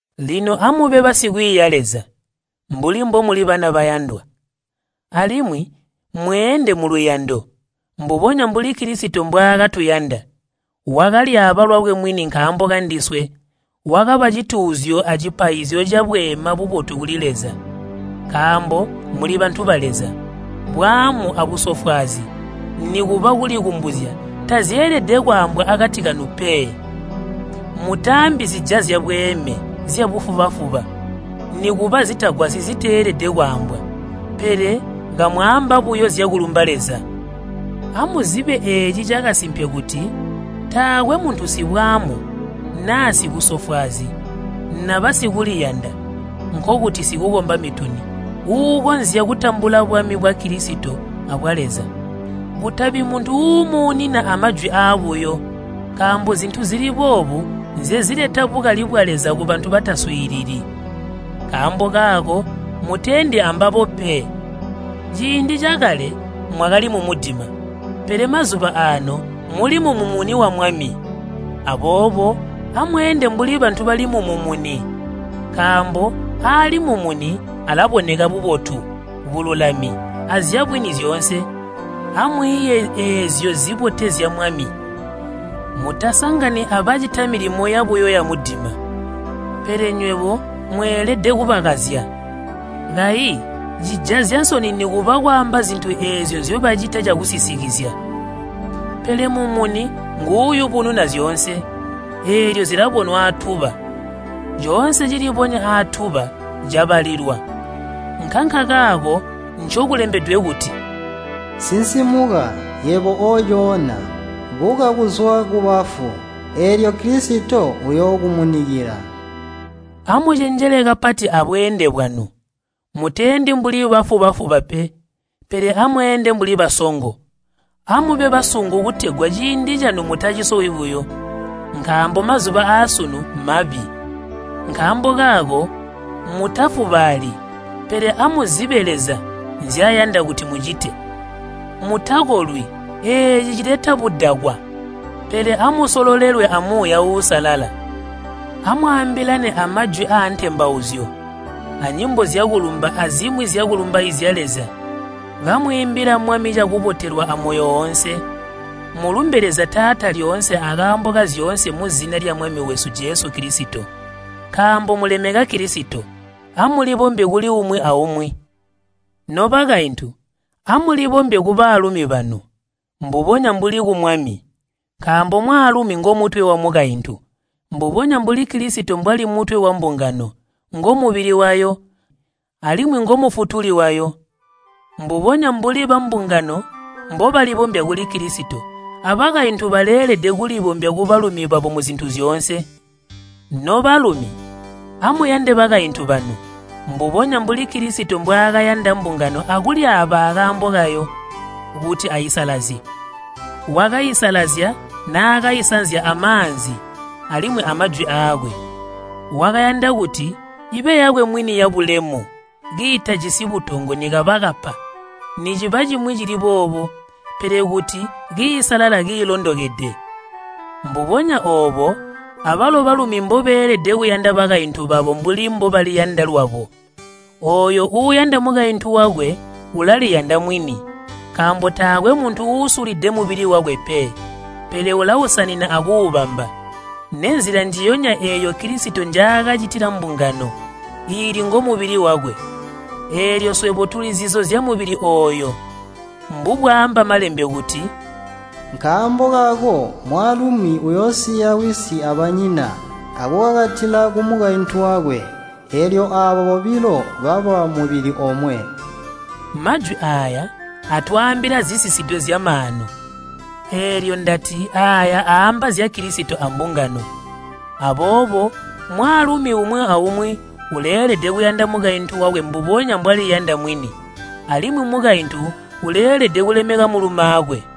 Lino amube basikwiiya Leza, mbuli mbomuli bana bayandwa. Alimwi mweende muluyando, mbubonya mbuli Kilisito mbwaakatuyanda. Wakalyaaba lwakwe mwini nkaambo kandiswe, wakaba cituuzyo acipaizyo cabweema bubotu kuli Leza. Nkaambo muli bantu ba Leza, bwaamu abusofwaazi nikuba kulikumbuzya tazyeelede kwaambwa akati kanu pe. Mutaambi zijazya bweeme, zyabufuba-fuba, nikuba zitagwasyi ziteelede kwaambwa, pele kamwaamba buyo zyakulumba Leza. Amuzibe eeci cakasimpe kuti taakwe muntu sibwaamu, naa sibusofwaazi, naba sikuliyanda (nkokuti sikukomba mituni) uukonzya kutambula bwami bwa Kilisito abwa Leza. Kutabi muntu uumuunina amajwi aabuyo, nkaambo zintu zili boobu nzezileta bukali bwa Leza kubantu bataswiilili. Nkaambo kaako muteendi ambabo pe. Ciindi cakale mwakali mumudima, pele mazuba aano muli mumumuni wa Mwami. Aboobo amweende mbuli bantu bali mumumuni. Nkaambo aali mumuni alaboneka bubotu, bululami, azyabwini zyoonse. Amwiiye eezyo zibotezya Mwami. Mutasangani abacita milimo yabuyo yamudima, pele nywebo mweelede kubakazya. Kayi cijazya nsoni nikuba kwaamba zintu eezyo nzyobacita cakusisikizya. Pele mumuni nguuyubununa zyoonse, eelyo zilabonwa aatuba. Coonse cilibonya aatuba cabalilwa. Nkankakaako ncokulembedwe kuti, “Sinsimuka, yebo oocoona, buka kuzwa kubafu, eelyo Kilisito uyookumunikila.” Amucenjele kapati abweende bwanu. Muteendi mbuli bafuba-fuba pe, pele amweende mbuli basongo. Amube basungu kutegwa ciindi canu mutacisowi buyo, nkaambo mazuba aasunu mabi. Nkaambo kaako mutafubaali, pele amuzibe Leza nzyayanda kuti mucite. Mutakolwi, eeci cileta budakwa, pele amusolelwe a Muuya Uusalala. Amwaambilane amajwi aantembauzyo, anyimbo zyakulumba azimwi zyakulumbaizya Leza kamwiimbila Mwami cakubotelwa amoyo woonse. Mulumbe Leza Taata lyoonse akaambo kazyoonse muzina lya Mwami wesu Jesu Kilisito. Nkaambo mulemeka Kilisito, amulibombye kuli umwi aumwi. Nobakaintu, amulibombye kubalumi banu, mbubonya mbuli ku Mwami. Nkaambo mwaalumi ngomutwe wamukaintu, mbubonya mbuli Kilisito mbwali mutwe wambungano, ngomubili wayo, alimwi ngo Mufutuli wayo. Mbubonya mbuli bambungano mbobalibombya kuli Kilisito, abakaintu baleelede kulibombya kubalumi babo muzintu zyoonse. Nobalumi, amuyande bakaintu banu, mbubonya mbuli Kilisito mbwaakayanda mbungano akulyaaba akaambo kayo kuti aisalazye. Wakaisalazya naakaisanzya amaanzi alimwi amajwi aakwe. Wakayanda kuti ibe yakwe mwini yabulemu, kiitajisi butongo nikaba kapa, niciba cimwi cili boobo, pele kuti kiisalala kiilondokede. Mbubonya oobo abalo balumi mbobeelede kuyanda bakaintu babo mbuli mbobaliyanda lwabo. Ooyo uuyanda mukaintu wakwe, ulaliyanda mwini. Nkaambo taakwe muntu uusulide mubili wakwe pe, pele ulausanina akuubamba. Nenzila njiyonya eeyo Kilisito njaakacitila mbungano iili ngomubili wakwe, eelyo swebo tuli zizo zyamubili ooyo. Mbubwaamba Malembe kuti, “Nkaambo kaako mwaalumi uyoosiya wisi abanyina akukakatila kumukaintu wakwe, eelyo aaba bobilo baba mubili omwe.” Majwi aaya atwaambila zisisidwe zyamaanu, eelyo ndati aaya aamba zya Kilisito ambungano. Aboobo, mwaalumi umwi aumwi uleelede kuyanda mukaintu wakwe mbubonya mbwaliyanda mwini, alimwi mukaintu uleelede kulemeka mulumaakwe.